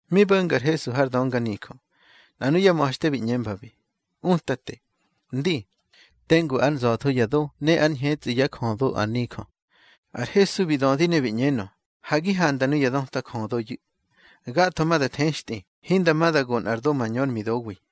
Mi bo̱nga ar Hesu har dönganijö, nꞌa nuyá ma̱xte bi ꞌñembabi: —Utate, ndi, tengu ár nza̱tho ya do ne ár ñhetsꞌi yá jödo ar nijö. Ar Hesu bi dödi ne bi ꞌñenö: —Ha gi handa nuya döta jödoyu̱. Gatho ma da thextꞌi, hinda ma da go nꞌar do mañör midowi.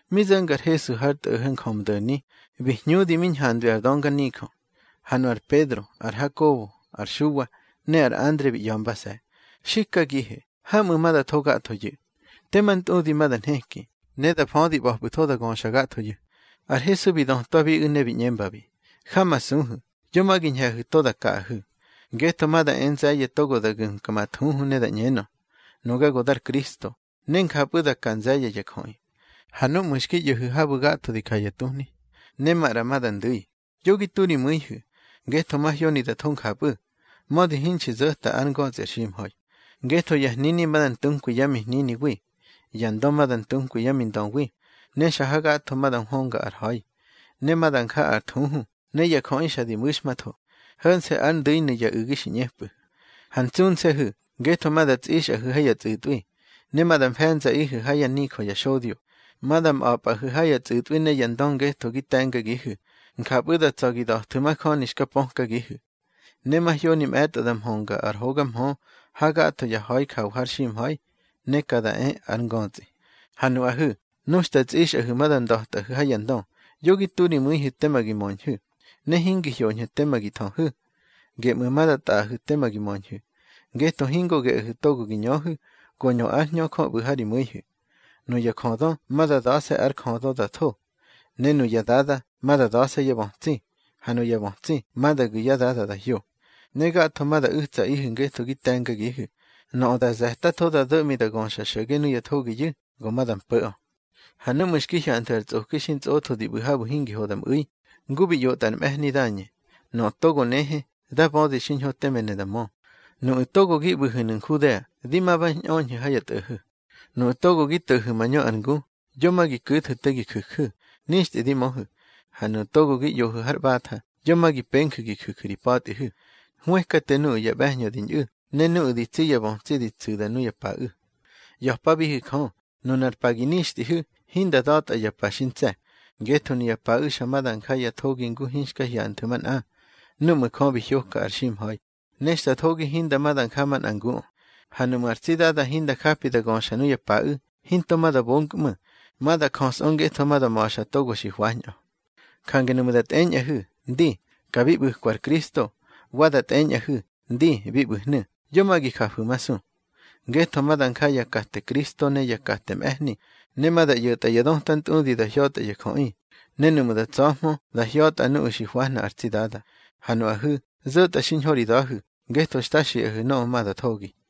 Mi zo̱nga ar Hesu har tꞌo̱ho̱ Njömdo̱ni, bi hñudi mi ñhandwi ar dönganijö. Ha nu ar Pedro, ar Hakobo, ar Xuwa, ne ar Andre bi ꞌya̱mbase̱: —Xikagihe, hamꞌu̱ ma da tho gathoyu̱. Tema ntꞌudi ma da nheki, ne da födi ꞌba̱pꞌu̱tho da göxa gathoyu̱. Ar Hesu bi dötwabiꞌu̱ ne bi ꞌñembabi: —Jamasuhu̱, yo ma gi ñhe̱hu̱ to da kaꞌahu̱. Ngetho ma da e nze̱ye̱ togo da gu̱mka ma thuhu da ꞌñenö: Nuga go dar Kristo. Ne njapꞌu̱ da ka nze̱ye̱ ya jöꞌi. Ha núꞌmu̱ xki ꞌyo̱hu̱ habu̱ gatho di ja ya tuhni, ne maꞌra ma da ndu̱i, yo gi tu ri mu̱ihu̱. Ngetho mahyoni da tho njapꞌu̱, mödi hinxi zo̱ta ár ngötsꞌi ar ximha̱i. Ngetho ya hnini ma da ntukwi yá mihniniwi, ya ndö ma da ntunkwi yá mindöwi. Ne xa hagatho ma da nhwönga ar ha̱i, ne ma da nja ar thuhu, ne ya jöꞌi xa di mu̱xmatho. Ho̱nse̱ ár ndu̱inu̱ ya u̱gi xi ꞌñepꞌu̱. Ha ntsunse̱hu̱, ngetho ma da tsꞌixꞌahu̱ ha ya tsꞌu̱tꞌwi, ne da mfe̱nzaꞌihu̱ ha yá nijö ya xodyo. Ma da mꞌa̱pꞌahu̱ ha ya tsꞌu̱tꞌwi ne ya ndö ngetho gi te̱ngagihu̱, njapꞌu̱ da tsa̱ gi da̱thu̱ majöni xka pökagihu̱. Ne mahyoni mꞌe̱tꞌo da mhönga ar hoga mhö ha gatho ya ha̱i jawa har ximha̱i, ne ka da e ar ngötsꞌi. Ha nuꞌahu̱, nu xta tsꞌixꞌahu̱ ma da nda̱tꞌahu̱ ha ya ndö, yo gi tu ri mu̱ihu̱ tema gi möñhu̱, ne hingi hyoñhu̱ tema gi thöhu̱. Geꞌmu̱ ma da tꞌaꞌahu̱ tema gi möñhu̱, ngetho hingo geꞌahu̱ togo gi ñöhu̱, go ñö ár Hñö Jö ꞌbu̱ ha ri mu̱ihu̱. Nuya njödö ma da da̱se̱ ár jödö da tho. Ne nuya dada ma da da̱se̱ yá bötsi, ha nuya bötsi ma da gu̱ yá dada da hyo. Ne gatho ma da u̱tsaꞌihu̱ ngetho gi te̱ngagihu̱. Nöꞌö da ze̱tatho, da do̱ꞌmi da göxa xo̱ge nuya thogiyu̱, go ma da mpo̱ꞌö. Ha núꞌmu̱ xki hyanthu̱ ar tsꞌoki xi ntsꞌotho di ꞌbu̱ habu̱ hingi ho da mꞌu̱i, ngu bi ꞌyotꞌa ar mꞌe̱hni Dañe (nöꞌö togo nehe, dá bödi xiñho teme ne da mö), nuꞌu̱ togo gi ꞌbu̱hu̱nu̱ Nhudea, di ma ba ñꞌöñhu̱ ha ya tꞌo̱ho̱. Nuꞌu̱ togo gi to̱hu̱ mañö ar ngu, yo ma gi ku̱thu̱ te gi ju̱ju̱. Nixtꞌi di möhu̱. Ha nuꞌu̱ togo gi ꞌyohu̱ har ꞌbatha, yo ma gi penju̱ gi ju̱ju̱ ri pa̱tꞌihu̱. Hwëkate nuꞌu̱ ya ꞌbe̱hñö di ñꞌu̱, ne nuꞌu̱ di tsi yá bötsi di tsu̱da nuya paꞌu̱. ꞌYa̱pabihu̱ Jö, nunar pa gi nixtꞌihu̱, hinda da̱tꞌa ya pa xi ntse̱. Ngetho nuya paꞌu̱ xa ma da nja ya thogi ngu hinxka hyanthu̱ manꞌa, núꞌmu̱ Jö bi hyoka ar ximha̱i, ne xta thogi hinda ma da nja manꞌa nguꞌö. Ha nuꞌmu̱ ar tsi Dada hinda japi da göxa nuya paꞌu̱, hinto ma da bonkꞌmu̱. Ma da jösꞌö, ngetho ma da ma̱xa togo xi hwañꞌö. Jange nuꞌmu̱ da tꞌeñꞌahu̱: Ndi, ka bi ꞌbu̱kwa ar Kristo, wa da tꞌeñꞌahu̱: Ndi, bi ꞌbu̱hnu̱, yo ma gi jafu̱masu. Ngetho ma da nja ya kate Kristo ne ya kate mꞌe̱hni. Ne ma da ꞌyo̱tꞌa ya döta ntꞌudi da hya̱tꞌa ya jöꞌi, ne nuꞌmu̱ da tsa̱hmö, da hya̱tꞌa nuꞌu̱ xi hwahna ar tsi Dada. Ha nuꞌahu̱, zo̱tꞌa xiñho ri da̱hu̱, ngetho xta xiꞌahu̱ nöꞌö ma da thogi.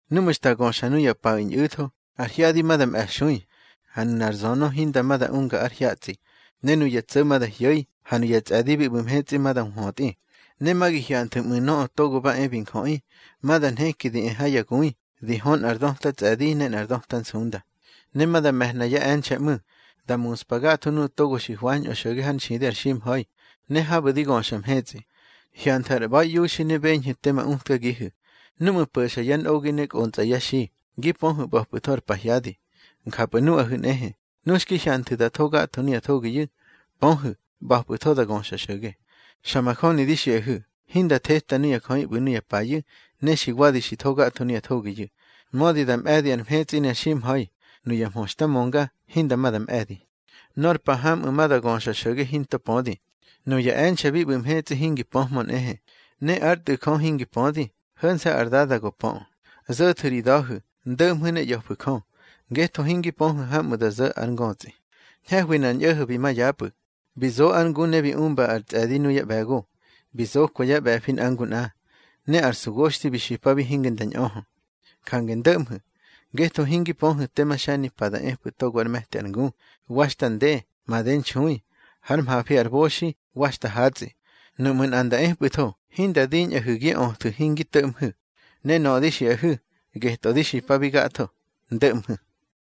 Núꞌmu̱ xta göxa nuya paꞌu̱ ñꞌu̱tho, ar hyadi ma da mꞌe̱xui, ha nunar zönö hinda ma da unga ár hyatsꞌi. Ne nuya tso̱ ma da hyo̱i, ha nuya tsꞌe̱di bi ꞌbu̱ mhetsꞌi ma da nhwötꞌi. Ne ma gi hyanthu̱ ꞌmu̱ Nöꞌö Togo ba e bi Njöꞌi, ma da nheki di e ha ya gui, di hö nꞌar döta tsꞌe̱di ne nꞌar döta nsunda. Ne ma da me̱hna yá e̱nxe̱ ꞌmu̱, da muspa gatho nuꞌu̱ togo xi hwañꞌö xo̱ge hár nxidi ar ximha̱i, ne habu̱ di göxa mhetsꞌi. Hyanthu̱ ar ꞌba̱iꞌiuxi ne beñhu̱ tema utkagihu̱: Núꞌmu̱ po̱xa yá nꞌogi ne kꞌontsꞌa yá xi, gi pöhu̱ ꞌba̱pꞌu̱tho ar pahyadi. Njapꞌu̱ nuꞌahu̱ nꞌehe, nu xki hyanthu̱ da tho gatho nuya thogiyu̱, pöhu̱, ꞌba̱pꞌu̱tho da göxa xo̱ge. Xa majöni di xiꞌahu̱, hinda theta nuya jöꞌi ꞌbu̱ nuya payu̱, ne xi wadi xi tho gatho nuya thogiyu̱. Mödi da mꞌe̱di ar mhetsꞌi ne ar ximha̱i, nuya mhö xta mönga, hinda ma da mꞌe̱di. Nor pa hamꞌu̱ ma da göxa xo̱ge hinto pödi. Nuya e̱nxe̱ bi ꞌbu̱ mhetsꞌi hingi pöhmö nꞌehe, ne ár Tꞌu̱ Jö hingi pödi, ho̱nse̱ ar Dada go pöꞌö. Zo̱thu̱ ri da̱hu̱, ndo̱ꞌmhu̱ ne ꞌya̱fu̱ Jö, ngetho hingi pöhu̱ hamꞌu̱ da zo̱ ar ngötsꞌi. Ñhe̱hwi nꞌar ñꞌo̱ho̱ bi ma yapꞌu̱, bi zo ár ngu ne bi umba ar tsꞌe̱di nuyá ꞌbe̱go. Bi zokwa yá ꞌbe̱fi nꞌa ngu nꞌa, ne ar sugoxthi bi xipabi hinge nda ñꞌöhö. Jange ndo̱ꞌmhu̱, ngetho hingi pöhu̱ tema xe̱nimpa da epꞌu̱ togo ár me̱ti ar ngu, wa xta nde, made nxui, hár mhafi ar boxi, wa xta hatsꞌi. Nuꞌmu̱ nꞌa nda epꞌu̱tho, hinda diñꞌahu̱ gi öthu̱ hingi to̱ꞌmhu̱. Ne nöꞌö di xiꞌahu̱, getꞌö di xipabi gatho: Ndo̱ꞌmhu̱.